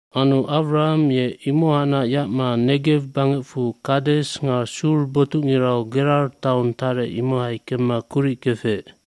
aAnu Awraham ye imohacnac yacma Negew bangecfu Kades nga Sur botucngirau Gerar taong tarec imohai kemma kuric kefec.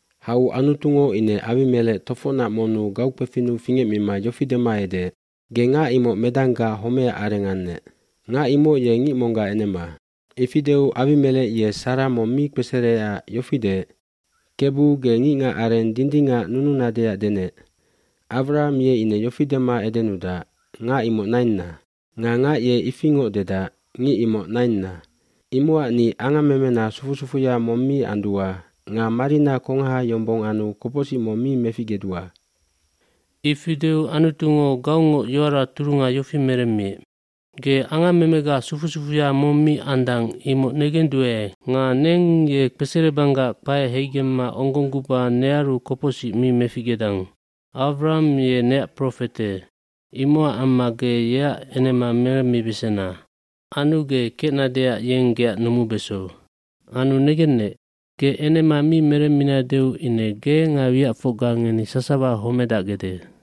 cHau Anutungo ine Awimelec tofocnac monnu gaukpefinnu fingecmima yofi dema edeec, “Ge ngac imoc medanggac homecac areng annec. Ngac imoc ye ngic monggac enema.” Ifi deu Awimelec ye Sara mong mi kpesereecac yofi deec, “Kebu, ge ngicngacareng dindingac nununadeac denec? Awraham ye ine yofi dema edenudac, ‘Ngac imoc nainna.’ Nga ngac ye ifingoc dedac, ‘Ngic imoc nainna.’ Imocac ni angammemena sufu sufuya mong mi andua nga marina kongaha yombong anu kopocsic mong mi meficgedua.” Ifi deu Anutungo gaungoc yoara turunga yofi meremmiec, “Ge angammemega sufu sufuya mong mi andang imoc negenduae nga neng ye kpeserebanggac kpae heigemma onggongguba nearu kopocsic mi meficgedang. dAwraham ye neac profete imocac amma ge yeac enema meremmibesena. Anu ge kecnadeac yeng geac numubeso. Anu negennec, ge enema mi meremminadeu ine ge nga wiacfocga ngeni sasawa homedacgede.”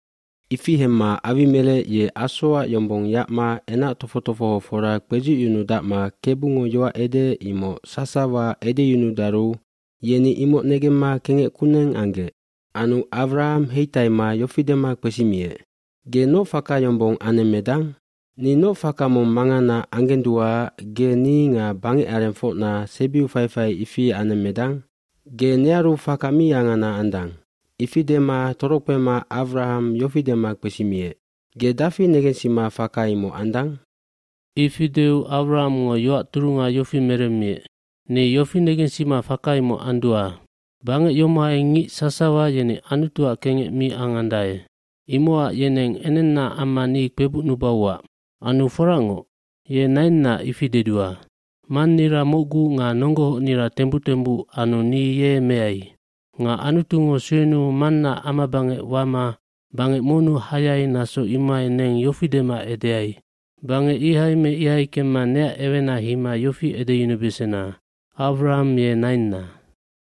Ifi hemma Awimelec ye asoac yombong yacma enac tofoc tofohofora kpedzucyunudacma Kebungo yoac edeec imoc sasawa edeyunudaru yeni imoc negemma kengec kuneng anggec. Anu Awraham heitaima yofi dema kpesimiec, “Ge noc faka yombong anemmedang? Ni noc faka mong mangana anggenduaac ge ni nga bangecarengfocna sebiu faifai ifi anemmedang? Ge nearu faka mi angana andang.” Ifi dema torokpema Awraham yofi dema kpesimiec, “Ge dafi negensima faka imoc andang?” eIfi deu Awrahamngo yoac turunga yofi meremmiec, “Ni yofi negensima faka imoc andua. Bangec yomohai ngic sasawa yeni Anutuac kengec mi angandae imocac yeneng enennaac amma ni kpebucnubauac. Anu foracngoc, ye nainna ifi dedua. Mannira mocgu nga nonggohocnira tembuc tembuc anu ni ye meai. Nga Anutungo suenuu mannaac amabangec wama bangec monnu hayai naso imohai neng yofi dema edeai, ‘Bangec ihai me ihai kemma neac ewena heima yofi edeyunubesena, Awraham ye nainna.’”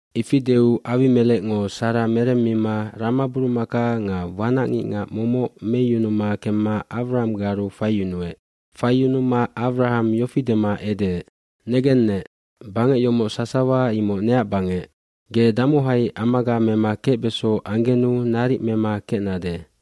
fIfi deu Awimelecngo Sara meremmima ramaburumaka nga wanacngicngac momoc meyumuma kemma Awrahamgaru faiyunuec. Faiyunuma Awraham yofi dema edeec, “Negennec, bangec yomoc sasawa imoc neac bangec. Ge damohai amaga mema kecbeso anggenu naric mema kecnade.”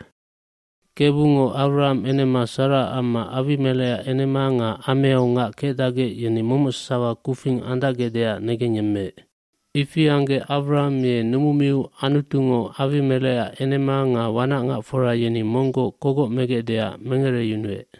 g Kebungo Awraham enema Saraac amma Awimelecac enema nga ameau ngac kecdacgec yeni momoc sasawa kufing andacgecdeac negengyemmeec. Ifi anggec Awraham ye numumiu Anutungo Awimelecac enema nga wanacngacfora yeni monggoc kogoc megecdeac mengereyunuec.